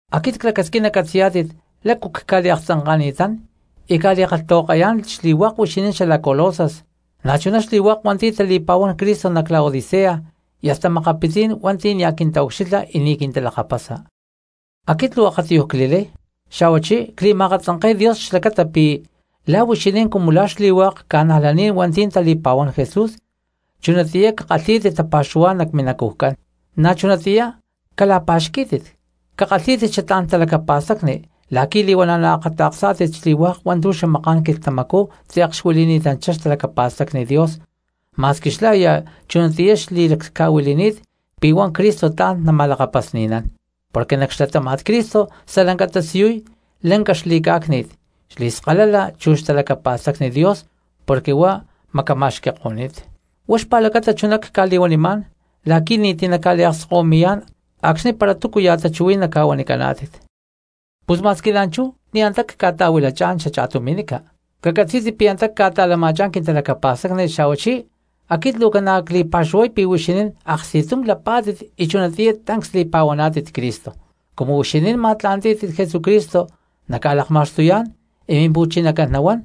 Aquit clacasquín nacatzi̠yá̠tit lácu cca̠liakatzanka̠ni̠tán cca̠li̠kalhtahuakayá̠n xli̠hua̠k huixinín xalac Colosas, na̠chuná xli̠hua̠k hua̠nti̠ tali̠pa̠huán Cristo nac Laodicea, y hasta makapitzí̠n hua̠nti̠ nia̠ quintaucxilha y ni̠ quintalakapasa. Aquit luu akatiyuj cli̠lay, xa̠huachí cli̠ma̠akatzanke̠y Dios xlacata pi̠ la̠ huixinín cumu la̠ xli̠hua̠k cristianos hua̠nti̠ tali̠pa̠huán Jesús, chunatiyá cakalhí̠tit tapa̠xuhuá̠n nac minacujcán, na̠ chunatiyá cala̠pa̠xquí̠tit, cakalhí̠tit xatlá̠n talacapa̠stacni la̠qui̠ li̠huana̠ naakata̠ksá̠tit xli̠hua̠k hua̠ntu̠ xamaká̠n quilhtamacú tze̠k xuili̠ni̠tanchá xtalacapa̠stacni Dios, ma̠squi xlá aya chunatiyá xli̠laclhca̠huili̠ni̠t pi̠ huá Cristo tla̠n nama̠lakapasni̠nán. Porque nac xlatáma̠t Cristo stalanca tasiyuy lanca xli̠cá̠cni̠t, xli̠skalala chu xtalacapa̠stacni Dios porque huá macama̠xqui̠ko̠ni̠t. Huá xpa̠lacata chuná cca̠li̠huanimá̠n la̠qui̠ ni̠ti̠ naca̠liakskahuimi̠yá̠n acxni̠ para túcuya̠ tachuhuí̠n naca̠huanicaná̠tit. Pus ma̠squi la̠nchú ni̠ antá cca̠ta̠huilachá̠n xacha̠tumi̠nica, cacatzí̠tit pi̠ antá ca̠ta̠lama̠chá̠n quintalacapa̠stacni, xa̠huachí aquit luu ca̠na cli̠pa̠xuhuay pi̠ huixinín aksti̠tum lapá̠tit y chunatiyá tancs li̠pa̠huaná̠tit Cristo. Cumu huixinín ma̠tla̠ntí̠tit Jesucristo naca̠lakma̠xtuyá̠n y Mimpu̠chinacán nahuán,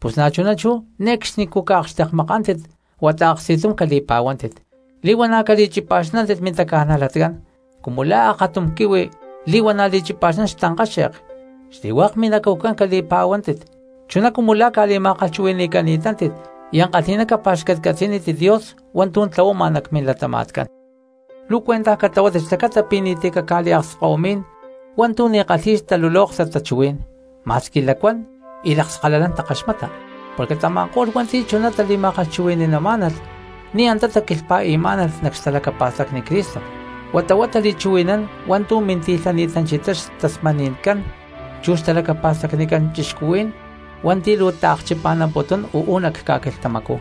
pus na̠chuná chú ne̠cxnicú caakxtekmakántit huata aksti̠tum cali̠pa̠huántit. Li̠huana̠ cali̠chipa̠xnántit mintaca̠najlatcán cumu la̠ aktum quihui li̠huana̠ li̠chipa̠xnán xtankáxe̠k, xli̠hua̠k minacujcán cali̠pa̠huántit chuná cumu la̠ ca̠li̠ma̠kalhchuhui̠ni̠cántit y ankalhi̠ná capa̠xcatcatzi̠nítit Dios hua̠ntu̠ tlahuama nac milatama̠tcán. Luu cuentaj catlahuátit xlacata pi̠ ni̠ti̠ caca̠liakskahuimí̠n hua̠ntu̠ ni̠ kalhi̠y xtalulóktat tachuhuí̠n ma̠squi lacuán y lakskalalán takaxmata, porque tama̠ko̠lh hua̠nti̠ chuná tali̠ma̠kalhchuhui̠ni̠namá̠nalh ni̠ antá taquilhpa̠i̠má̠nalh nac xtalacapa̠stacni Cristo huata huá tali̠chuhui̠nán hua̠ntu̠ minti̠lhani̠tanchá xtasmani̠ncán chu xtalacapa̠stacnicán cristianos hua̠nti̠ luu akchipa̠namputún uú nac ca̠quilhtamacú.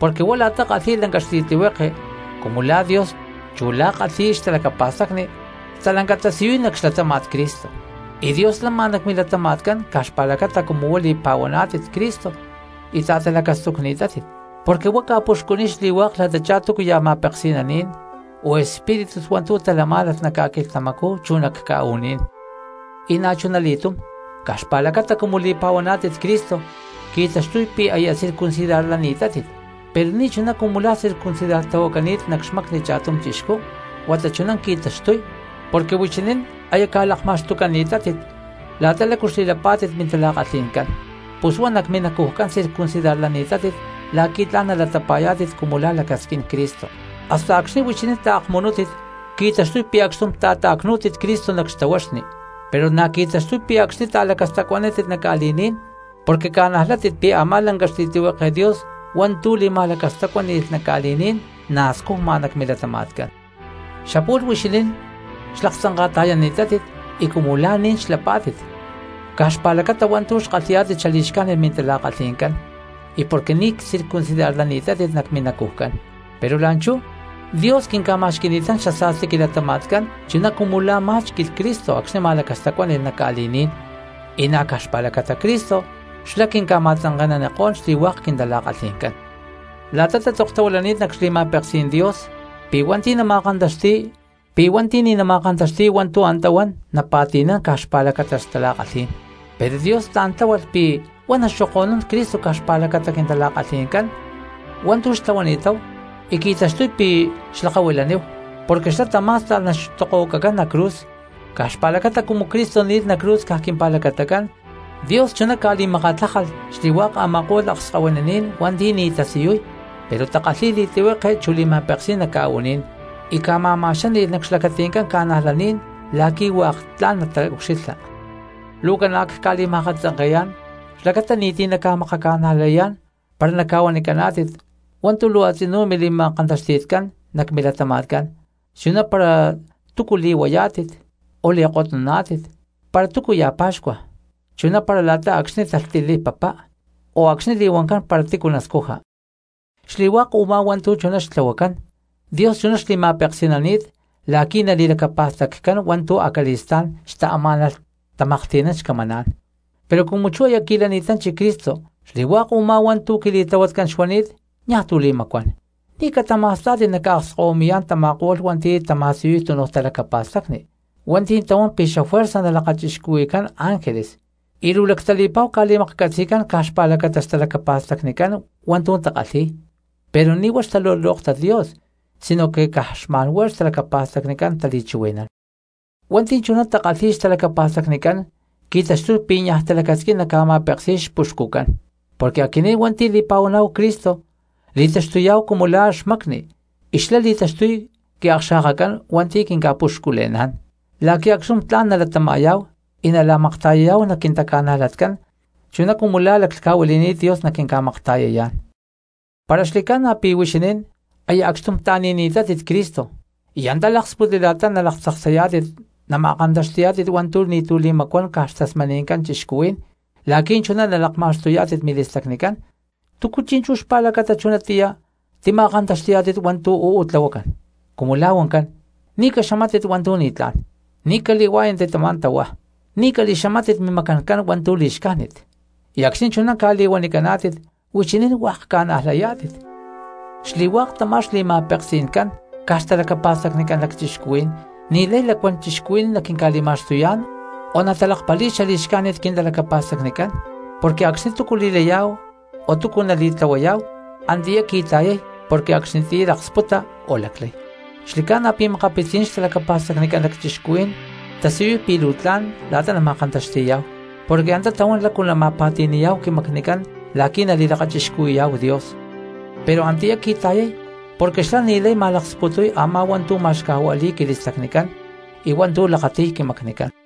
Porque huá la̠ta kalhi̠y lanca xli̠tlihueke cumu la̠ Dios chu la̠ta kalhi̠y xtalacapa̠stacni, stalanca tasiyuy nac xlatáma̠t Cristo. Y Dios lama nac milatama̠tcán caj xpa̠lacata cumu huá li̠pa̠huaná̠tit Cristo y ta̠talacastucni̠tátit, porque huá ca̠puxcuniy xli̠hua̠k la̠tachá túcuya̠ ma̠peksi̠naní̠n o espíritus hua̠ntu̠ talamá̠nalh nac ca̠quilhtamacú chu nac ca̠u̠ní̠n. Y na̠chuna li̠túm caj xpa̠lacata cumu li̠pa̠huaná̠tit Cristo qui̠taxtuy pi̠ aya circuncidarlani̠tátit, pero ni̠chuná cumu la̠ circuncidartlahuacani̠t nac xmacni cha̠tum chixcú, huata chuná qui̠taxtuy porque huixinín aya ca̠lakma̠xtucani̠tátit la̠ta lácu xli̠lapá̠tit mintala̠kalhi̠ncán, pus huá nac minacujcán circuncidarlani̠tátit la̠qui̠ tla̠n nalatapa̠yá̠tit cumu la̠ lacasquín Cristo. Hasta acxni̠ huixinín taakmunútit qui̠taxtuy pi̠ acxtum ta̠ta̠cnú̠tit Cristo nac xtahuaxni, pero na̠ qui̠taxtuy pi̠ acxtum ta̠lacastacuanántit nac ca̠li̠ní̠n porque ca̠najlayá̠tit pi̠ a̠má lanca xli̠tlihueke Dios hua̠ntu̠ li̠ma̠lacastacuáni̠lh nac ca̠li̠ní̠n na̠ scujma nac milatama̠tcán. Xapu̠lh huixinín xlaktzanka̠ta̠yani̠tátit y cumu la̠ ni̠ní̠n xlapá̠tit caj xpa̠lacata hua̠ntu̠ xkalhi̠yá̠tit xali̠xcájnit mintala̠kalhi̠ncán y porque ni̠ csircuncidarlani̠tátit nac minacujcán. Pero la̠nchú Dios quinca̠ma̠xqui̠ni̠tán xasa̠sti quilatama̠tcán chuná cumu la̠ má̠xqui̠lh Cristo acxni̠ ma̠lacastacuáni̠lh nac ca̠li̠ní̠n, y na̠ caj xpa̠lacata Cristo xlá quinca̠ma̠tzanke̠nanikó̠n xli̠hua̠k quintala̠kalhi̠ncán. La̠ta tatzoktahuilani̠t nac xli̠ma̠peksí̠n Dios pi̠ hua̠nti̠ ni̠ nama̠kantaxti̠y hua̠ntu̠ antá huan napa̠ti̠nán caj xpa̠lacata xtala̠kalhí̠n, pero Dios tla̠n tláhualh pi̠ huá naxoko̠nuniy Cristo caj xpa̠lacata quintala̠kalhi̠ncán hua̠ntu̠ xtlahuani̠táhu y qui̠taxtuy pi̠ xlakahuilaníhu, porque xlá tamá̠sta̠lh naxtokohuacacán nac cruz. Caj xpa̠lacata cumu Cristo ni̠lh nac cruz caj quimpa̠lacatacán Dios chuná ca̠li̠makatlájalh xli̠hua̠k a̠ma̠ko̠lh akskahuinaní̠n hua̠nti̠ ni̠ tasiyuy pero takalhi̠y li̠tlihueke chu li̠ma̠peksí̠n nac ca̠u̠ní̠n, y ca̠ma̠ma̠xáni̠lh nac xlacati̠ncán cristianos la̠qui̠ hua̠k tla̠n nataucxilha. Luu ca̠na cca̠li̠ma̠katzanke̠yá̠n xlacata ni̠ti̠ naca̠makaca̠najlayá̠n para naca̠huanicaná̠tit hua̠ntu̠ luu a̠tzinú mili̠ma̠kantaxti̠tcán nac milatama̠tcán, chuná para túcu li̠huayá̠tit o li̠kotnuná̠tit, para túcuya̠ pa̠xcua chuná para la̠ta acxni̠ talhtiliy papá o acxni̠ li̠huancán para tícu nascuja. Xli̠hua̠k u̠má hua̠ntu̠ chuná xtlahuacán, Dios chuná xli̠ma̠peksi̠nani̠t la̠qui̠ nali̠lacapa̠staccán hua̠ntu̠ acali̠stá̠n xtaamá̠nalh tamaklhti̠nán xcamaná̠n, pero cumu chú aya qui̠lani̠tanchi Cristo xli̠hua̠k u̠má hua̠ntu̠ quili̠tlahuatcán xuani̠t niaj tu̠ li̠macuán. Ni̠ catama̠stá̠tit naca̠akskahuimi̠yá̠n tama̠ko̠lh hua̠nti̠ tama̠siyuy túnuj talacapa̠stacni, hua̠nti̠ tahuán pi̠ xafuerza nalakachixcuhui̠cán ángeles y luu lactali̠pa̠hu ca̠li̠maklhcatzi̠cán caj xpa̠lacata xtalacapa̠stacnicán hua̠ntu̠ takalhi̠y, pero ni̠ huá xtalulóktat Dios sino que caj xma̠nhuá xtalacapa̠stacnicán tali̠chuhui̠nán. Hua̠nti̠ chuná takalhi̠y xtalacapa̠stacnicán qui̠taxtuy pi̠ niaj talacasquín naca̠ma̠peksi̠y xpuxcucán, porque aquinín hua̠nti̠ li̠pa̠huaná̠hu Cristo li̠taxtuyá̠hu cumu la̠ xmacni y xlá li̠taxtuy quiakxa̠kacán hua̠nti̠ quinca̠puxcule̠ná̠n la̠qui̠ acxtum tla̠n nalatama̠yá̠hu y nala̠makta̠yayá̠hu nac quintaca̠najlatcán chuná cumu la̠ laclhca̠huili̠ni̠t Dios naquinca̠makta̠yayá̠n. Para xli̠ca̠na pi̠ huixinín aya acxtum ta̠ni̠ni̠tátit Cristo y antá láksputli la̠ta nalaktzaksayá̠tit nama̠kantaxti̠yá̠tit hua̠ntu̠ ni̠tu̠ li̠macuán caj xtasmani̠ncán cristianos la̠qui̠ chuná nalakma̠xtuyá̠tit mili̠stacnicán, ¿túcu chi̠nchú xpa̠lacata chunatiyá tima̠kantaxti̠yá̠tit hua̠ntu̠ uú tlahuacán, cumu la̠ huancán: “Ni̠ caxamátit hua̠ntu̠ ni̠tlá̠n, ni̠ cali̠hua̠yántit tamá tahuá, ni̠ cali̠xamátit mimacancán hua̠ntu̠ li̠xcájnit”? Y acxni̠ chuná ca̠li̠huanicaná̠tit huixinín hua̠k ca̠najlayá̠tit. Xli̠hua̠k tamá xli̠ma̠peksi̠ncán caj xtalacapa̠stacnicán lacchixcuhuí̠n ni̠lay lacuán cristianos naquinca̠li̠ma̠xtuyá̠n o natalakpali̠y xali̠xcájnit quintalacapa̠stacnicán, porque acxni̠ túcu nali̠laya o túcu nali̠tlahuaya antiyá qui̠ta̠yay porque acxnitiyá laksputa o laclay. Xli̠ca̠na pi̠ makapitzí̠n xtalacapa̠stacnicán lacchixcuhuí̠n tasiyuy pi̠ luu tla̠n la̠ta nama̠kantaxti̠yá̠hu porque antá tahuán lácu nama̠pa̠ti̠ni̠yá̠hu quimacnicán la̠qui̠ nali̠lakachixcuhui̠yá̠hu Dios, pero antiyá qui̠ta̠yay porque xlá ni̠lay ma̠laksputuy a̠má hua̠ntu̠ ma̠xcajua̠li̠y quili̠stacnicán y hua̠ntu̠ lakati̠y quimacnicán.